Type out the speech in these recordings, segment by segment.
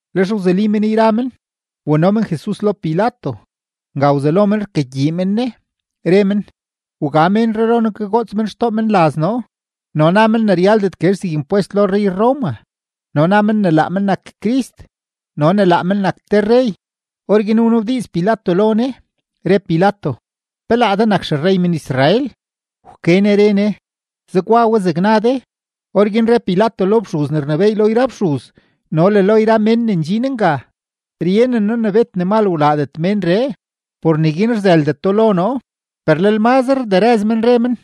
Lex wzuli men yra men, wano men Jesus lo Pilato. Nga wzelo men rkagyii men Ne, re men: ―Wga ménree lo noo kagoots men xtoo menlaz noo, no na men ne ryaldet guezh zeg impwest lo rrey-Roma, no na men ne laa men nak Crist no ne laa men nak te rrey. Orguin wnabdiiz Pilato lo Ne, re Pilato: ―¿Pe laa de nak xerrey men-Israel? Wke Ne re Ne: ―Zegwa we zeg na de. Orguin re Pilato lo fxuz ne rnebééy lo yra fxuz no le lo yra mén ne ndxin nga: ―Ryenen noo ne bet ne mal wlaadet ménree, por neguin rzëldeto lo noo. Per lel mazre rderëz men, re men: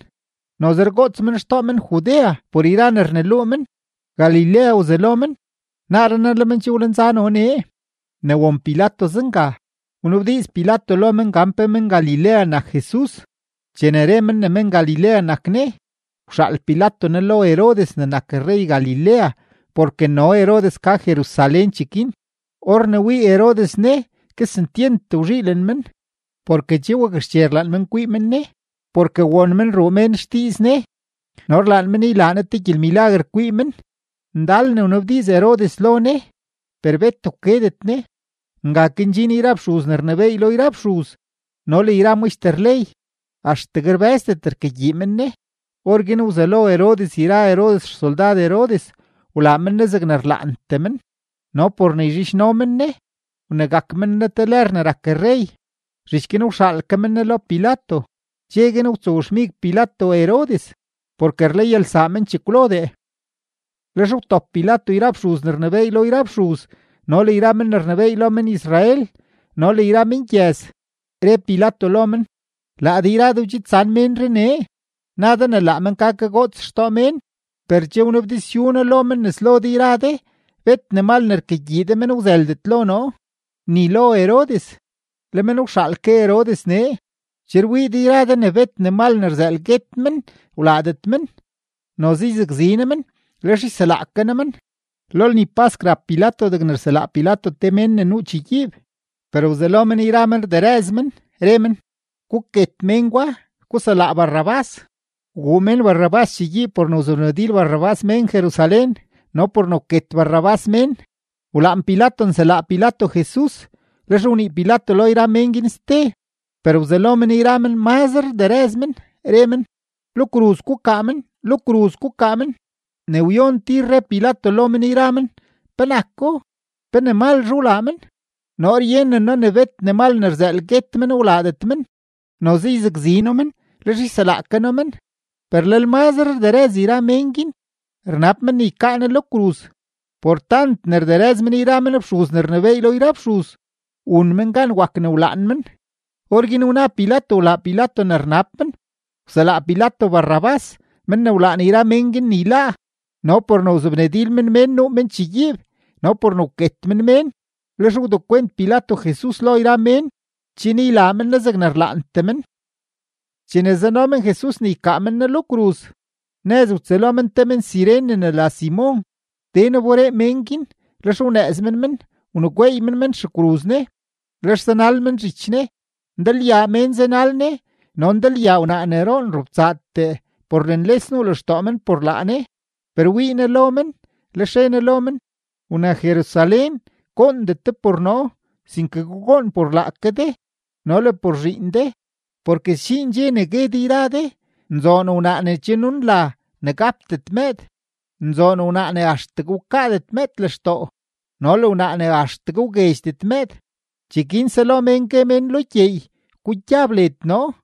―Noze rgoots men xtoo men-Judea por yra ne rneluu men. Galilea wzelo men, naaree naa le men che wlenza no nee. Ne won Pilato zenga, wnabdiiz Pilato lo men gan pe men-Galilea nak Jesus. Chene re men ne men-Galilea nak Ne, wxaal Pilato Ne lo Herodes ne nak rrey Galilea porke no Herodes ka Jerusalén cheguin. Or ne wii Herodes Ne, kesentyent wzhiilen men, porke che wakxche rlaan men kwii men Ne, porke won men ruu mén xdiiz Ne no rlaan men ne ylaa Ne te gyelmilaguer kwii men. Ndal ne wnabdiiz Herodes lo Ne, per bet wkedet Ne. Nga ke ndxin yra fxuz ne rnebééy lo yra fxuz no le yra maxter ley, axtegue rbë́zdet rkagyii men Ne. Orguin wzelo Herodes yra Herodes xsoldad Herodes wlaa men Ne zegne rlaantee men, no por ne yzhidxno men Ne, wnegak men Ne te lër ne rak rrey. Zhich guin wxaal ke men Ne lo Pilato. Dxe guin wtsowxmig Pilato Herodes, porke rlayalsaa men chekwlodee. Lex wtop Pilato yra fxuz ne rnebééy lo yra fxuz no le yra men ne rnebééy lo men-Israel no le yra mengyëz. Re Pilato lo men: ―Laa de yra de wdxidsan ménree nee; na de ne laa men ka kagoots xtoo mén; per che wnabdizyu noo lo men nes lo de yra de, bet ne mal ne rkagyii de men wzëldet lo noo, ni lo Herodes, le men wxaal ke Herodes nee. Che rwii de yra de ne bet ne mal ne rzëël guet men wlaadet men. Noze yzakzi noo men, lex yselaa ke noo men. Lo lni pask rap Pilato degne rselaa Pilato te mén ne nuu chegyiib. Per wzelo men yra men rderëz men, re men: ―¡Guket men gwa! ¡Guselaa Barrabás! Wguu mén Barrabás chegyiib por ne wzobnadil Barrabás mén Jerusalén no por ne wket Barrabás mén. Wlaan Pilato nselaa Pilato Jesus, lex wnii Pilato lo yra men guin ste. Per wzelo men yra men mazre rderëz men, re men: ―¡Lo kruz gukaa men! ¡Lo kruz gukaa men! Ne wyon tir re Pilato lo men yra men: ―¿Penako? ¿Pe ne malzhe wlaa men? Noo ryenen noo ne bet ne mal ne rzëël guet men wlaadet men. Noze yzakzi noo men, lex yselaa ke noo men. Per lel mazre rderëz yra mén guin, rnab men ne ykaa Ne lo kruz. Por tant ne rderëz men yra men fxuz ne rnebééy lo yra fxuz, wun men gan wak ne wlaan men. Orguin wna Pilato wlaa Pilato ne rnab men. Wselaa Pilato Barrabás, men ne wlaan yra mén guin ne yláá, no por ne wzobnadil men mén nuu men chegyiib no por ne wket men mén. Lex wdekwent Pilato Jesus lo yra mén chen ylaa men Ne zegne rlaantee men. Chene zano men Jesus ne ykaa men Ne lo kruz, nëz wtsëlo men te men-Cirene ne la Simon, den wberee men guin; lex wnëëz men men, wnegweey men men xekruz Ne, lex zanal men zhich Ne. Ndalyaa mén zanal Ne no ndalyaa wnaa ne roon robtsaatee por ne nles nuu lextoo men por laa Ne. Per wii Ne lo men, lex re Ne lo men: ―Wna-Jerusalén, goondet de por noo, sinke gugoon por laake de no le por zhiin de. Porke sdxiin dxe ne gue de yra de: “Nzoon wnaa ne che nunla ne gapdet mëëd, nzoon wnaa ne axtegue wkaadet mëëd lextoo no le wnaa ne axtegue wguedxdet mëëd.” Cheguin selo mén gue men lo gyeey: “Gugyab led noo”;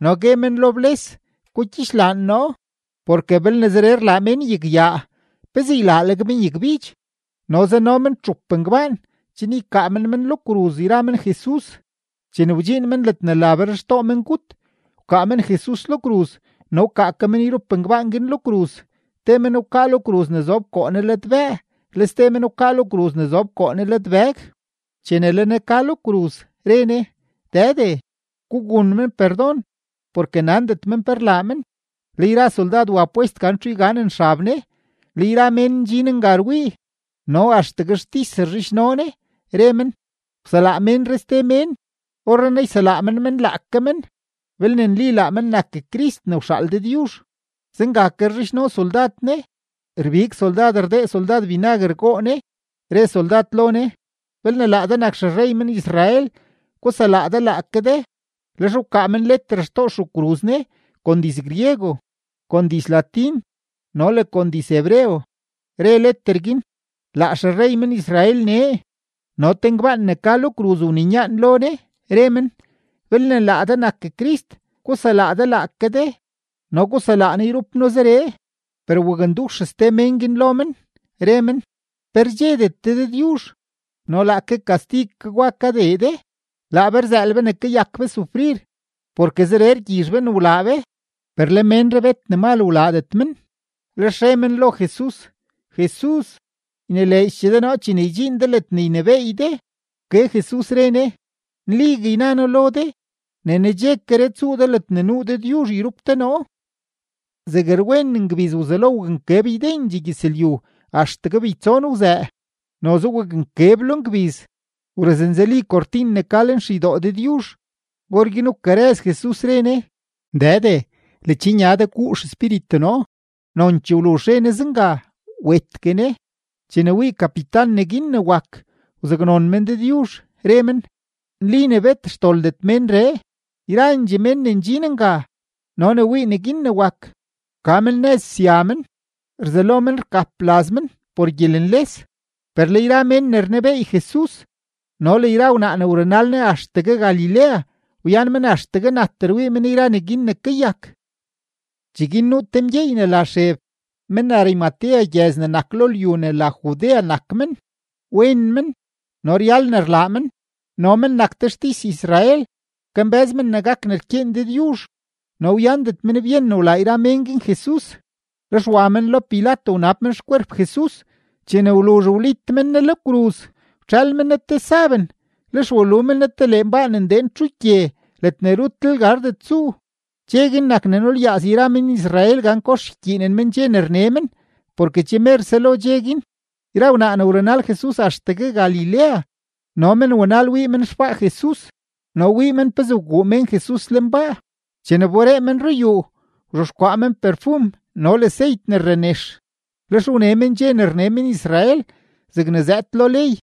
no gue men lo bles: “Gugyixlaan noo.” Porke belne zeree rlaa mén yagyaa, ¿pezee ylaaleg men yagbidx? No zano men txup ngbaan chen ykaa men men lo kruz yra men Jesus. Chene wdxiin men ledne la Berxtoo Mengut, wkaa men Jesus lo kruz no wkaa ke men yrup ngbaan guin lo kruz: te men wkaa lo kruz ne zob koo Ne ladbëë, le ste men wkaa lo kruz ne zob koo Ne ladbëg. Chene le Ne ka lo kruz, re Ne: ―Dëde, gugun men perdon porke nandet men pe rlaa men. Le yra soldad wa pwest gan txu yganen xab Ne. Le yra mén ndxin nga rwii, no axtegue xtis rzhidxno Ne, re men: ―Wselaa ménree ste mén; orrenaa yselaa men men laake men, belne nli laa men nak Crist ne wxaal Dëdyuzh. Zenga ke rzhidxno soldad Ne, rbig soldad rdee soldad binaguer goo Ne. Re soldad lo Ne: ―Belne laa de nak xerrey men-Israel, guselaa de laake de. Lex wkaa men leter xtoo xekruz Ne kon diz-griego, kon diz-latín no le kon diz-hebreo, re leter guin: “Laa xerrey men-Israel nee.” No te ngbaan ne ka lo kruz wninyaan lo Ne, re men: ―Belne laa de nak Crist, guselaa de laake de no guselaa noo yrup noo zeree. Per wakndux ste mén guin lo men, re men: ―¿Pe rdxedet de Dëdyuzh, no laake kastig ke gwa kadee de? Laa be rzëël be ne kayak be sufrir, porke zeree rgyizh be ne wlaa be, per le ménree bet ne mal wlaadet men. Lex re men lo Jesus: ―Jesus, ynileedxchee de noo chene ydxiin de ledne ynebééy de. Wke Jesus, re Ne: ―Nligue yna noo lo de, ne nedxekeree tsuu de ledne nuu Dëdyuzh yrup de noo. Zeg rwen ngbiz wzelo waknkeb ydendxee gyëzlyu axtegue beytson wzëë. Noze waknkeb lo ngbiz; wrëznzeli kortin ne ka lenxeydoo Dëdyuzh. Orguin wkarëz Jesus, re Ne: ―Dëde, ledxnya de guu xespíritu noo. Nonchee wluzh re Ne zenga, wetgue Ne. Chene wii kapitan neguin ne wak, wzaknon men Dëdyuzh, re men: ―Nli ne bet xdoldet ménree. Yrandxee mén ne ndxin nga no ne wii neguin ne wak, wka men nëz sya men, rzelo men rgap laz men por gyelenles. Per le yra mén ne rnebeey Jesus no le yra wnaa ne wrunal Ne axtegue Galilea, wyan men axtegue nat rwii men yra neguin ne kayak. Cheguin nuu te mgyeey ne la Xeb, men-Arimatea gyëz ne nak lo lyu ne la Judea nak men. Wen men no ryal ne rlaa men no men nak te xtis-Israel. Kambë́z men ne gak ne rkyeen Dëdyuzh, no wyandet men byen ne wlaa yra mén guin Jesus. Lex wa men lo Pilato wnab men xkwerp Jesus. Chene wluzh wlit men Ne lo kruz, wtxël men Ne te saben, lex walu men Ne te lenbaa ne ndeen txugye ledne rutlel gardet tsuu. Dxe guin nak ne nulyaaz yra men-Israel gan kox ykyiinen men dxe ne rne men porke che mer selo dxe guin. Yra wnaa ne wrunal Jesus axtegue Galilea, no men wanal wii men xbaa Jesus no wii men pezee wguu mén Jesus lenbaa. Chene wberee men ruyuu, wzhexkwaa men perfum no le seyt ne rrenex. Lex wne men dxe ne rne men-Israel zegne zëëd lo ley.